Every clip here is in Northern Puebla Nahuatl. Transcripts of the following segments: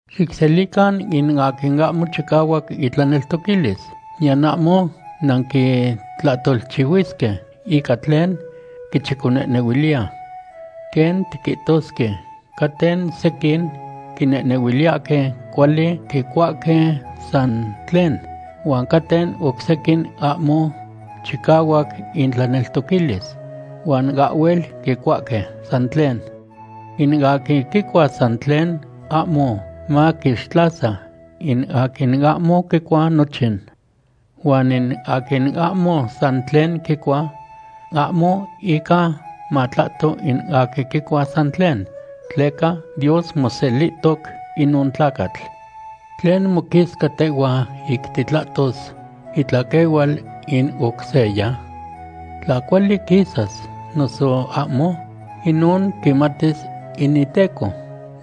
Xicselican in aquin ahmo chicahuac itlaneltoquilis, niyan ahmo nanquitlahtolchihuisque ica tlen quichiconehnehuiliya. Quen tiquihtosque, caten sequin quinehnehuiliyahque cuali quicuahque san tlen, huan caten oc sequin ahmo chicahuac intlaneltoquilis, huan ahhuel quicuahque san tlen. In aquin quicua san tlen ahmo maquixtlasa in aquin ahmo quicua nochin. Huan in aquin ahmo san tlen quicua ahmo ica matlahto in aquin quicua san tlen, tleca Dios moselihtoc inon tlacatl. ¿Tlen moquisca tehhua ic titlahtos itlaquehual in oc seya? Tla cuali quisas noso ahmo, inon quimatis in iteco.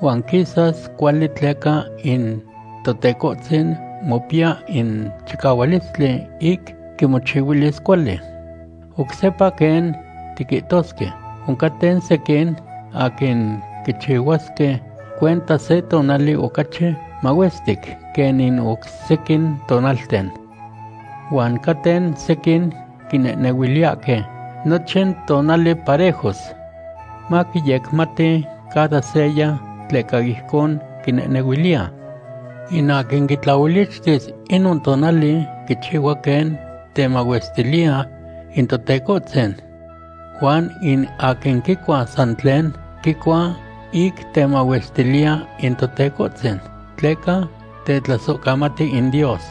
Huan quisas cuali tleca in Totecohtzin mopiya in chicahualistli ic quimochihuilis cuali. Oc sepa quen tiquihtosque, oncaten sequin aquin quichihuasque cuenta se tonali ocachi mahuestic quen in oc sequin tonalten. Huan caten sequin quinehnehuiliyahque nochin tonali parejos. Maquiyecmati cada seya tleca ijcon quinehnehuiliya. In aquin quitlaolichtis inon tonali, quichihua quen temahuestiliya in Totecohtzin. Huan in aquin quicua san tlen, quicua ic temahuestiliya in Totecohtzin, tleca tetlasohcamati in Dios.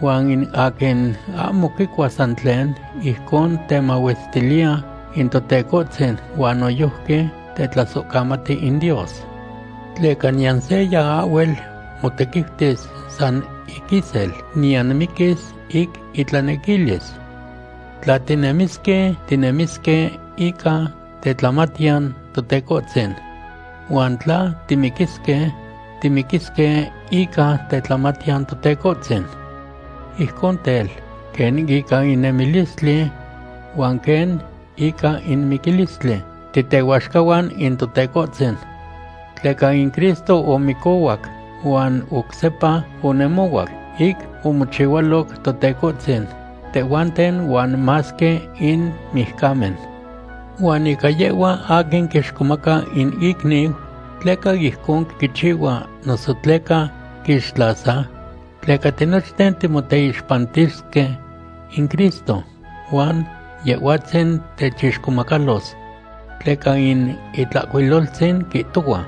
Huan in aquin ahmo quicua san tlen, ijcon temahuestiliya in Totecohtzin huan noyojqui tetlasohcamati in Dios. Tleca niyan seya ahhuel motequiutis san ic isel, niyan miquis ic itlanequilis. Tla tinemisque, tinemisque ica tetlamatiyan Totecohtzin. Huan tla timiquisque, timiquisque ica tetlamatiyan Totecohtzin. Ijcon tel, quen ica in nemilistli huan quen ica in miquilistli titehuaxcahuan in Totecohtzin. Tleca in Cristo omicohuac huan oc sepa onemohuac ic omochihualoc Totecohtzin tehhuanten huan masque in mijcamen. Huan ica yehhua aquin quixcomaca in icniu; ¿tleca ijcon quichihua noso tleca quixtlasa? Tleca tinochten timoteixpantisque in Cristo, huan Yehhuatzin techixcomacalos. Tleca in Itlahcuiloltzin quihtohua: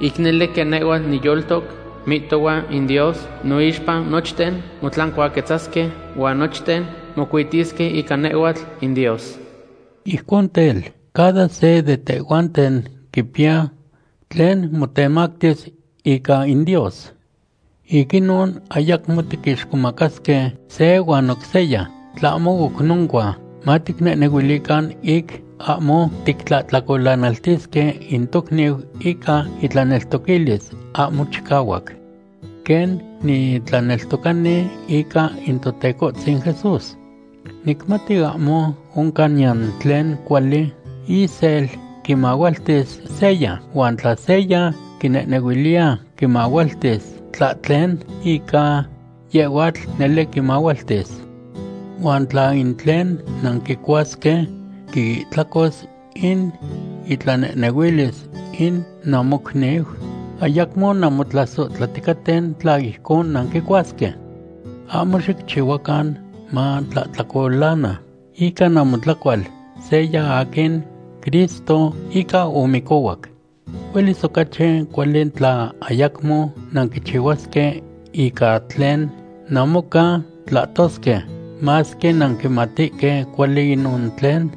Ic nele quen nehhua niyoltoc, mihtohua in Dios, noixpa nochten motlancuaquetzasque, huan nochten mocuitisque ica nehhuatl in Dios. Ijcon tel, cada se de tehhuanten quipiya tlen motemactis ica in Dios. Ic inon, ayacmo tiquixcomacasque se huan oc seya. Tlahmo oc noncua, maticnehnehuilican ic ahmo tictlahtlacolanaltisque in tocniu ica itlaneltoquilis ahmo chicahuac. Quen nitlaneltocani ica in Totecohtzin Jesús, nicmati ahmo oncan niyan tlen cuali isel quimahualtis seya, huan tla seya quinehnehuiliya quimahualtis tlahtlen, ica yehhuatl nele quimahualtis. Huan tla in tlen nanquicuasque quiihtlacos in itlanehnehuilis in namocniu, ayacmo nanmotlasohtlaticaten tla ijcon nanquicuasque. Ahmo xicchihuacan matlahtlacolana ica namotlacual seya aquin Cristo ica omicohuac. Huelis ocachi cuali tla ayacmo nanquichihuasque ica tlen namoca tlahtosque, masque nanquimatihque cuali inon tlen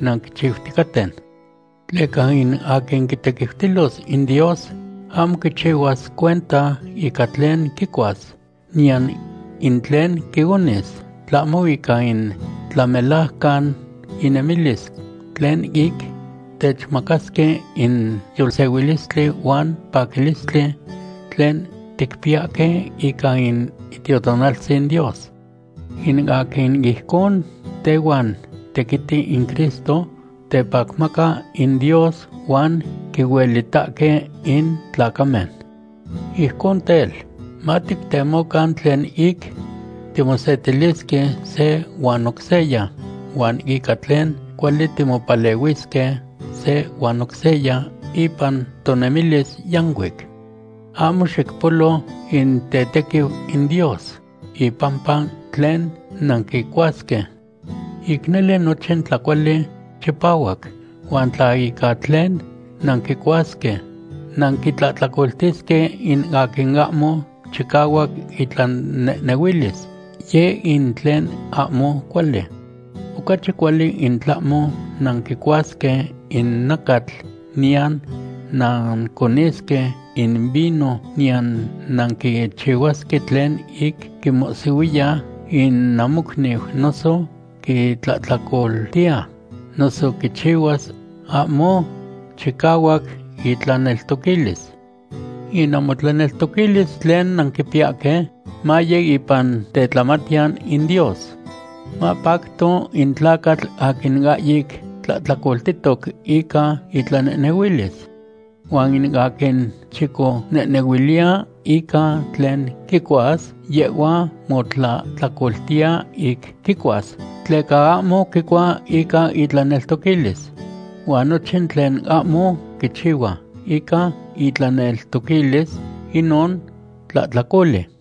nanquichiuticaten. Tleca in aquin quitequiutilos in Dios ahmo quichihuas cuenta ica tlen quicuas niyan in tlen quionis, tlahmo ica in tlamelajcan inemilis tlen ic techmacasque in yolsehuilistli huan paquilistli tlen ticpiyahque ica in Itiotonaltzin Dios. In aquin ijcon tehuan tequiti in Cristo tepacmaca in Dios huan quihuelitahque in tlacamen. Ijcon tel, matictemocan tlen ic timosetilisque se huan oc seya huan ica tlen cuali timopalehuisque se huan oc seya ipan tonemilis yancuic. Ahmo xicpolo in tetequiu in Dios ipampa tlen nanquicuasque. Ic nele nochin tlacuali chipahuac, huan tla ica tlen nanquicuasque, nanquitlahtlacoltisque in aquin ahmo chicahuac itlanehnehuilis, yeh in tlen ahmo cuali. Ocachi cuali in tlahmo nanquicuasque in nacatl niyan nanconisque in vino niyan nanquichihuasque tlen ic quimohsihuiya in namocniu noso quitlahtlacoltiya, noso quichihuas ahmo chicahuac itlaneltoquilis. In namotlaneltoquilis tlen nanquipiyahque, maye ipan tetlamatiyan in Dios. Mapacto in tlacatl aquin ahyic tlahtlacoltihtoc ica itlanehnehuilis. Huan in aquin chiconehnehuiliya ica tlen quicuas, yehhua motlahtlacoltiya ic quicuas, tleca ahmo quicua ica itlaneltoquilis. Huan nochin tlen ahmo quichihua ica itlaneltoquilis, inon tlahtlacoli.